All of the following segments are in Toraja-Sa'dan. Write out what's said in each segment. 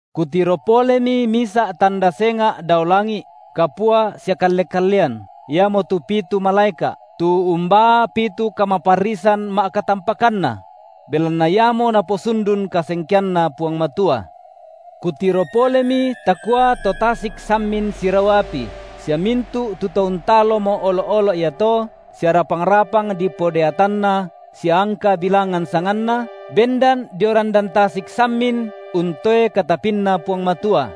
Kutiro polemi misa’ tanda senga’ dao langi’, kapua sia kalle-kallean, iamotu pitu malaeka’, tu umbaa pitu kamaparrisan ma’katampakanna; belanna iamo naposundun kasengkeanNa Puang Matua. Kutiro polemi takua to tasik sammin sirau api, sia mintu’ tu to untalomo olo’-olo’ iato sia rapang-rapang dipodeatanna sia angka bilangan sanganna, bendan dio randan tasik sammin untoe katapinNa Puang Matua.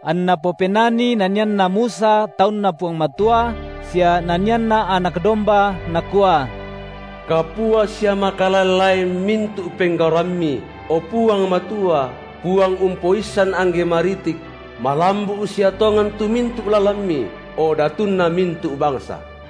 Anna popenani nanianna Musa taunNa Puang Matua sia nanianNa Anak domba nakua: Kapua sia makalaen-laen mintu’ penggauramMi, o Puang Matua, Puang Umpoissan angge maritik; malambu’ sia tongan tu mintu’ lalanMi, o Datunna mintu’ bangsa.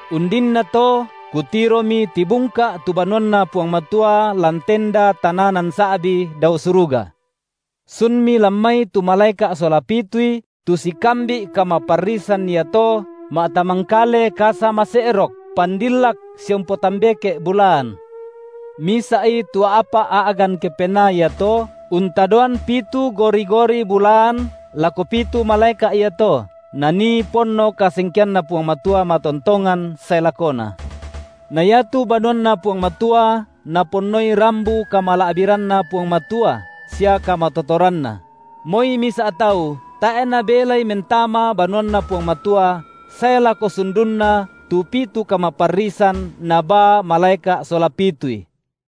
Undinnato kutiromi tibungka’ tu banuanNa Puang Matua lan tenda tananan sa’bi dao suruga; sunmi lan mai tu malaeka’ sola pitui tu sikambi’ kamaparrisan iato ma’tamangkale kasa mase’rok, pandillak sia umpotambeke’ bulaan. Misa’i tu a’pa’ a’gan kepenaa iato untadoan pitu gori-gori bulaan lako pitu malaeka’ iato, nanii ponno kasengkeanNa Puang Matua matontongan sae lakona. Na iatu banuanNa Puang Matua naponnoi rambu kamala’biranNa Puang Matua sia kamatotoranNa; moi misa’ tau tae’ nabelai mentama banuanNa Puang Matua sae lako sundunna tu pitu kamaparrisan nabaa malaeka’ sola pitui.